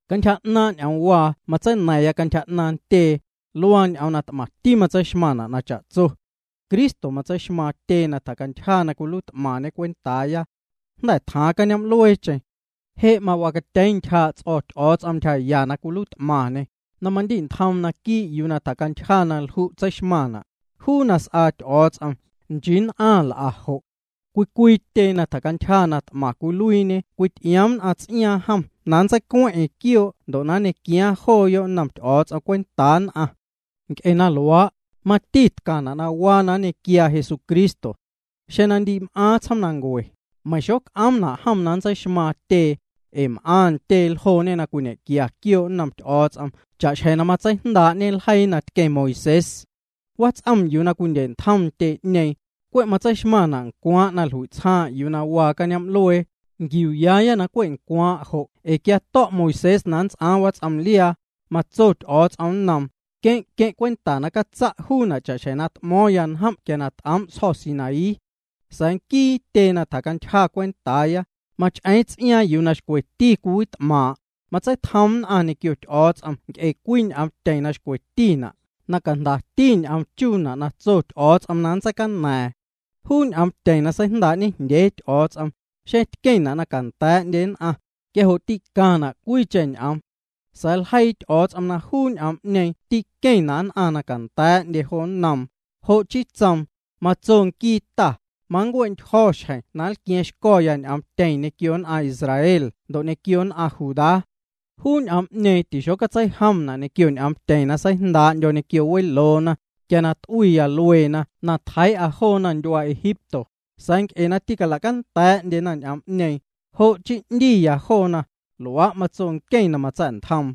Cantyja 'naaⁿ' ñ'oomwaa na matseina̱ⁿ cantyja 'naaⁿ ntyee, luaa ñ'oom na t'maⁿti tseixmaⁿna' na cha'tso. Cristo matseixmaaⁿ tyee na tjacantyja na cwiluiit'maⁿñê cwentaaya. Jnda̱ tjaaⁿ cañoom'lueecheⁿ. Je' mawacatyeeⁿ ntyjaa' ts'o̱ Ty'o̱o̱ts'om ntyjaya na macwiluiit'maⁿñê, na mamandi'ntjoom naquii' yuu na tjacantyja na lju' tseixmaⁿna', juu na s'aa nquii Ty'o̱o̱ts'om, nchii nn'aⁿ l'a jo'. Cwii cwii tyee na tjacantyja na t'maⁿ cwiluiiñe cwity'ioomna ts'iaaⁿ jom na nntseicueⁿ'eⁿ quioo' ndo' na ñequiaaⁿ jooyo' nnom Ty'o̱o̱ts'om cwentaa nn'aⁿ. Nc'e na luaa', mati tcaⁿna' na waa na nñequiaa Jesucristo. Xeⁿ na ndi m'aaⁿ tsjoomnancue, meiⁿ xoc'oomna' jom na nntseixmaaⁿ tyee, ee m'aⁿ ntyee ljooñe na cwinequia quioo' nnom Ty'o̱o̱ts'om cha'xjeⁿ matseijndaa'ñe ljeii na tqueⁿ Moisés. Wats'om yuu na cwindye'ntjom ntyee'ñeeⁿ, cwe' tseixmaⁿna' ncwaaⁿ' na jlui'tsjaaⁿ' juu na waa cañoom'luee. Nquiuuyaaya na cwe' ncwaaⁿ' jo' ee quia to̱' Moisés na nnts'aaⁿ wats'omliaa, matso Ty'o̱o̱ts'om nnoom: “Queⁿ' queⁿ' cwenta na catsa' juuna' cha'xjeⁿ na t'mo̱o̱ⁿya njom' quia t'oom' sjo̱ Sinaí.” Sa̱a̱ nquii tyee na tjacantyja cwentaaya, mach'eeⁿ ts'iaaⁿ yuu na xcweti cwiwit'maaⁿ', matseitjoom nn'aⁿ ñequio Ty'o̱o̱ts'om nc'e cwii ñ'oomtyeⁿ na xcwetina', na cajndati ñ'oom chuuna' na tso Ty'o̱o̱ts'om na nntseicana̱a̱ⁿ. Juu ñ'oomtyeⁿ na seijndaa'ñe jndyee Ty'o̱o̱ts'om, xeⁿ tqueⁿna' na canda̱a̱'ndye nn'aⁿ, quia jo' tîcaⁿna' cwiicheⁿ ñ'oom. Sa̱a̱ ljeii Ty'o̱o̱ts'om na juu ñ'oom'ñeeⁿ tîqueⁿna' nn'aⁿ na canda̱a̱'ndye jo nnoom, jo' chii tsoom: Matso nquii Ta: Mancue'ntyjo̱ xjeⁿ na nlqua̱a̱ⁿxco̱ ñ'oomtyeⁿ ñequio nn'aⁿ Israel ndo' ñequio nn'aⁿ Judá. Juu ñ'oom'ñeeⁿ tixotseijomna' ñequio ñ'oomtyeⁿ na seijndaa'ndyo̱ ñequio weloona, quia na t'uiya lueena na tjeii'a joona ndyuaa Egipto; sa̱a̱ nc'e na tîcala'canda̱a̱'ndyena ñ'oom'ñeeⁿ, jo' chii 'ndiya joona, luaa' matso nqueⁿ na matsa̱'ntjoom.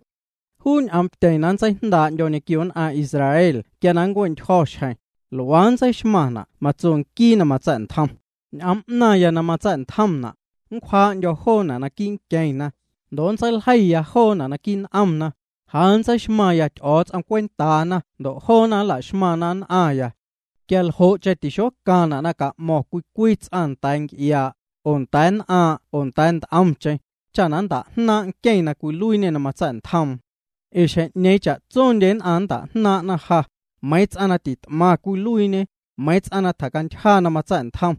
Juu ñ'oomtyeⁿ na nntseijndaa'ndyo̱ ñequio nn'aⁿ Israel quia na nncue'ntyjo̱ xjeⁿ, luaa nntseixmaⁿna' matso nquii na matsa̱'ntjom: Ñ'oom 'naⁿya na matsa̱'ntjomna', nncwjaa'ndyo̱ joona' naquii' nqueⁿna, ndo' nntseiljeiya joona' naquii' n'omna. Ja nntseixmaⁿya Ty'o̱o̱ts'om cwentaana ndo' joona nla'xmaⁿna nn'aⁿya. Quia ljo'cheⁿ tixocaⁿna' na ca'mo̱ⁿ cwii cwii ts'aⁿ nda̱a̱ nc'iaa', oo nda̱a̱ nn'aaⁿ'aⁿ oo nda̱a̱ nt'omcheⁿ, cha nnta'jnaaⁿ'na nqueⁿ na cwiluiiñê na matsa̱'ntjoom, ee xjeⁿ'ñeeⁿ cha'tsondye nn'aⁿ nnta'jnaaⁿ'na ja, meiiⁿ ts'aⁿ na tit'maⁿ cwiluiiñe, meiiⁿ ts'aⁿ na tjacantyja na matsa̱'ntjom.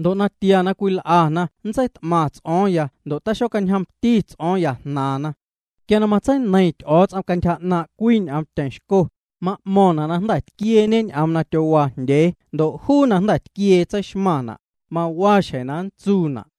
Ndo' natia na cwil'ana nntseit'maⁿ ts'o̱o̱ⁿ ndo' xocañjomti ts'o̱o̱ⁿya jnaaⁿna. Quia na matseineiⁿ Ty'o̱o̱ts'om cantyja 'naaⁿ' cwii ñ'oomtyeⁿ xco, ma'mo̱ⁿna' na jnda̱ tquieeñe ñ'oom na tyowaa jndyee ndo' juu na jnda̱ tquiee tseixmaⁿna', mawaa xjeⁿ na nntsuuna'.